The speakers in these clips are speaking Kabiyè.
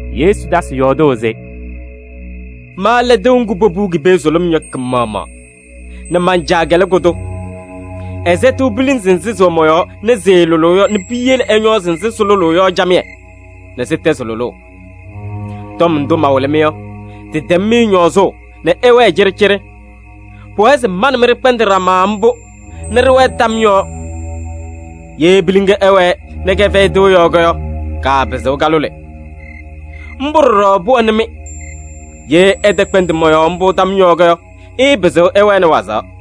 Yesu tasɩ yɔɔdʋʋ se: “Ma lɛ tɩʋ ŋgʋ popuu ki-pee sʋlʋm yɔ kɩ-maɣmaɣ nɛ man-Caa lɛ kʋ-tʋ. Ɛsɛtɩɣ pilinzi nzɩ sɩwɛ mɔ-yɔɔ nɛ sɩɩlʋlʋʋ yɔ nɛ piyele ɛñɔɔzɩ nzɩ sɩlʋlʋʋ yɔ camɩyɛ nɛ sɩtɛzɩ lʋlʋʋ. Tɔm ndʋ mawɩlɩ-mɩ yɔ, tɩtɛm-mɩ ñɔɔzʋʋ nɛ ɩwɛɛ cɩɖɩcɩɖɩ. Pʋwɛɛ se ma nɛ mɩ ɖɩkpɛndɩ ɖama mbʋ nɛ ɖɩwɛɛ tam yɔɔ. Ye piliŋa ɛwɛɛ nɛ kɛfɛyɩ tɩʋ yɔɔ yɔ, kaapɩzɩɣ kalʋlɩ. Mbʋ ɖɔɖɔ pʋwɛnɩ-mɩ, ye ɩtɛkpɛndɩ mɔ-yɔɔ mbʋ tam yɔɔ yɔ, ɩɩpɩzɩɣ ɩwɛnɩ wazaɣ.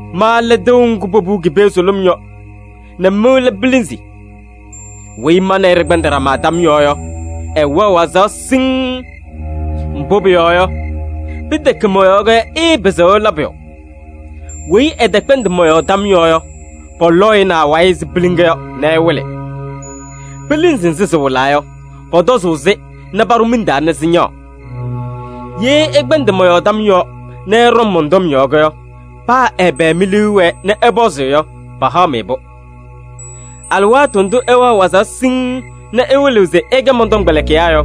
Ma lɛ tɩʋ ŋgʋ popuu ki-pee sʋlʋm yɔ nɛ mɩ lɛ pilinzi. Weyi ma nɛ ɩ ɖɩkpɛndɩ ɖama tam yɔɔ yɔ, ɛwɛɣ wazaɣ siŋŋ. Mbʋ pʋyɔɔ yɔ, pɩtɛkɛ mɔ-yɔɔ yɔ, ɩɩpɩzɩɣ ɩla pʋyʋ. Weyi ɛtɛkpɛndɩ mɔ-yɔɔ tam yɔɔ yɔ, pɔlɔ-ɩ nɛ awayɩ ɛzɩ piliŋa yɔ nɛ ɛwɩlɩ. Pilinzi nzɩ sɩwɩlaa yɔ, pɔtɔzʋʋ-sɩ nɛ paɖʋ miŋ taa nɛ sɩñaɣ. Ye ɩkpɛndɩ mɔ-yɔɔ tam yɔɔ nɛ ɩɖɔŋ mɔn-tɔm yɔɔ yɔ, paa ɛbɛ mi-liu ɛwɛɛ nɛ ɩpɔzɩ yɔ, pahaɣ-mɩ-pʋ. Alɩwaatʋ ndʋ ɩwɛɣ wazaɣ siŋŋ nɛ ɩwɩlɩɣ se ɩkɛ mɔn-tɔmkpɛlɩkɩyaa yɔ,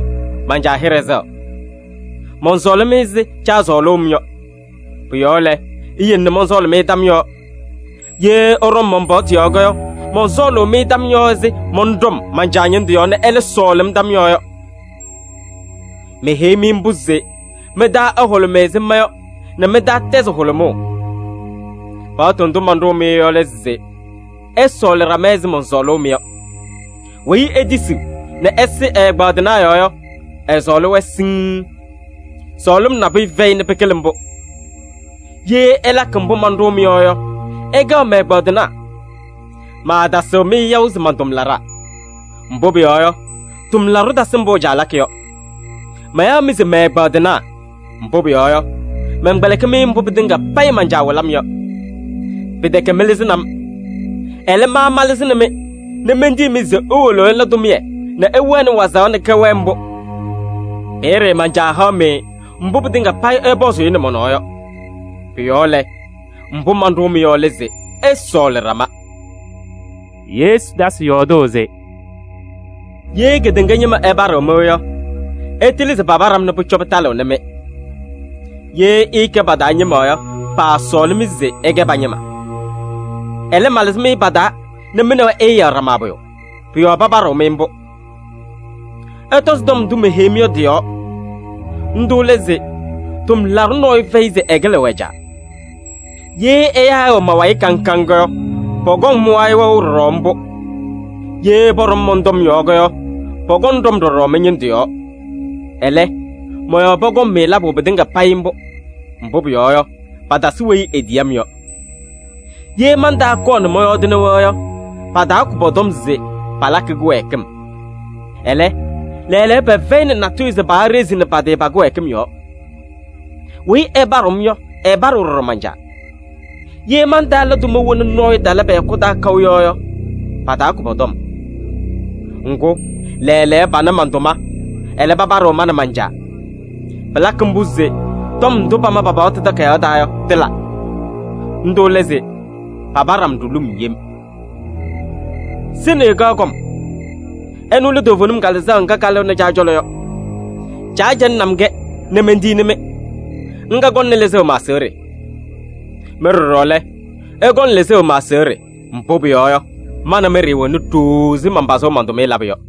man-Caa hɩɖɛ sɛɣ. Mɔnsɔɔlɩ-mɩ ɛzɩ Caa sɔɔlʋʋ-m yɔ. Pʋ-yɔɔ lɛ, iyele nɛ mɔnsɔɔlɩ-mɩ tam yɔɔ. Ye ɩɖɔŋ man-paɣtʋ yɔɔ yɔ, mɔnsɔɔlʋʋ-mɩ tam yɔɔ ɛzɩ mɔnɖɔm man-Caa ñɩndʋ yɔɔ nɛ ɛlɛ sɔɔlɩ-m tam yɔɔ yɔ. Meheyi-mɩ mbʋ se mɩ-taa ɛhʋlʋmɩ ɛzɩ ma yɔ nɛ mɩ-taa tɛzɩ hʋlʋmʋʋ. Paɣtʋ ndʋ manɖʋʋ-mɩ yɔ lɛ se: ɩsɔɔlɩ ɖama ɛzɩ mɔnsɔɔlʋʋ-mɩ yɔ. Weyi etisiɣ nɛ ɛsɩ ɛ-ɛgbaadɩnaa yɔɔ yɔ, ɛsɔɔlɩ-wɛ siŋŋ. Sɔɔlɩm nabʋyʋ fɛyɩ nɛ pɩkɩlɩ mbʋ. Ye ɩlakɩ mbʋ manɖʋʋ-mɩ yɔ yɔ, ɩkɛɣ mɛ-ɛgbaadɩnaa. Maatasɩɣ-mɩ yaʋ se man-tʋmlaɖaa, mbʋ pʋyɔɔ yɔ, tʋmlaɖʋ tasɩ mbʋ ɛ-caa lakɩ yɔ. Mayaɣ-mɩ se mɛ-ɛgbaadɩnaa, mbʋ pʋyɔɔ yɔ, mɛnkpɛlɩkɩ-mɩ mbʋ pɩtɩŋa payɩ man-Caa wɩlɩ-m yɔ. Pɩtɛkɛ mɩlɩzɩnɩ-m, ɛlɛ, ma malɩzɩnɩ-mɩ nɛ mentiyi-mɩ se iwolo ɩla tʋmɩyɛ nɛ ɩwɛnɩ wazaɣ nɛ kɛwɛɛ mbʋ. Peeye man-Caa haɣ-mɩ mbʋ pɩtɩŋa payɩ ɩpɔzʋʋ-ɩ nɛ mɔ-nɔɔ yɔ. Pʋ-yɔɔ lɛ, mbʋ manɖʋʋ-mɩ yɔ lɛ se: ɩsɔɔlɩ ɖama.” Yesu tasɩ yɔɔdʋʋ se: “Ye kedeŋa ñɩma ɛpaɖɩɣ-mɩ yɔ, ɩtɩlɩ se papaɖɩ-m nɛ pʋcɔ pɩtalɩɣnɩ-mɩ. Ye ɩɩkɛ pa-taa ñɩma yɔ, paasɔɔlɩ-mɩ se ɩkɛ pa-ñɩma. Ɛlɛ, malɩzɩ-mɩ pa-taa nɛ mɩ nɛ wɛ ɩɩyaɣ ɖama pʋyʋ, pʋ-yɔɔ papaɖɩɣ-mɩ mbʋ. Ɩtɔzɩ tɔm ndʋ meheyi-mɩ yɔ tɩ-yɔɔ. Ndʋ lɛ se: ‘Tʋmlaɖʋ nɔɔyʋ fɛyɩ se ɛkɩlɩɣ ɛ-caa.’ Ye ɛyaa ɛwɛ ma-wayɩ kaŋ kaŋ yɔ, pɔkɔŋ mɩ-wayɩ wɛʋ ɖɔɖɔ mbʋ. Ye pɔɖɔm mɔn-tɔm yɔɔ yɔ, pɔkɔŋ ɖɔm ɖɔɖɔ mɩ-ñɩndʋ yɔɔ. Ɛlɛ, mɔ-yɔɔ pɔkɔŋ-mɩ labʋ pɩtɩŋa payɩ mbʋ. Mbʋ pʋyɔɔ yɔ, patasɩ weyi etiyi-m yɔ. Ye mantaakɔɔ nɛ mɔyɔɔdɩnɩ-wɛ yɔ, pataakʋ pɔ-tɔm se palakɩ kɩwɛɛkɩm. Ɛlɛ, lɛɛlɛɛyɔ, pɛfɛyɩnɩ natʋyʋ se paaɖezini pa-tɩ pa-kɩwɛɛkɩm yɔɔ. Weyi ɛpaɖɩɣ-m yɔ, ɛpaɖɩɣ ɖɔɖɔ man-Caa. Ye mantaala tʋma wena nɔɔyʋ tala pɛ-hɛkʋ taa kaʋ yɔ yɔ, pataakʋ pɔ-tɔm. Ŋgʋ, lɛɛlɛɛyɔ pana man-tʋma, ɛlɛ, papadɩɣ ma nɛ man-Caa. Pɩlakɩ mbʋ se tɔm ndʋ pama pa-paɣtʋ takayaɣ taa yɔ, tɩla. Ndʋ lɛ se: ‘Papaɖɩ-m ɖulum yem.’ Sɩnɩyʋ kaɣ kɔm: ɛnʋ lɛ toovenim Kalɩzaɣ ŋga kalɩɣnɩ Caa cɔlɔ yɔ. Caa cɛlɩɣnɩ-m-kɛ nɛ mentiyini-mɩ, ŋga kɔŋnɩ lɩzʋʋ ma-aseɣɖe. Mɩ ɖɔɖɔ lɛ, ɩkɔŋ lɩzʋʋ ma-aseɣɖe, mbʋ pʋyɔɔ yɔ, ma nɛ mɩ ɖɩɩwɛnɩ ɖooo ɛzɩ manpazʋʋ man-tʋmɩyɛ labʋ yɔ.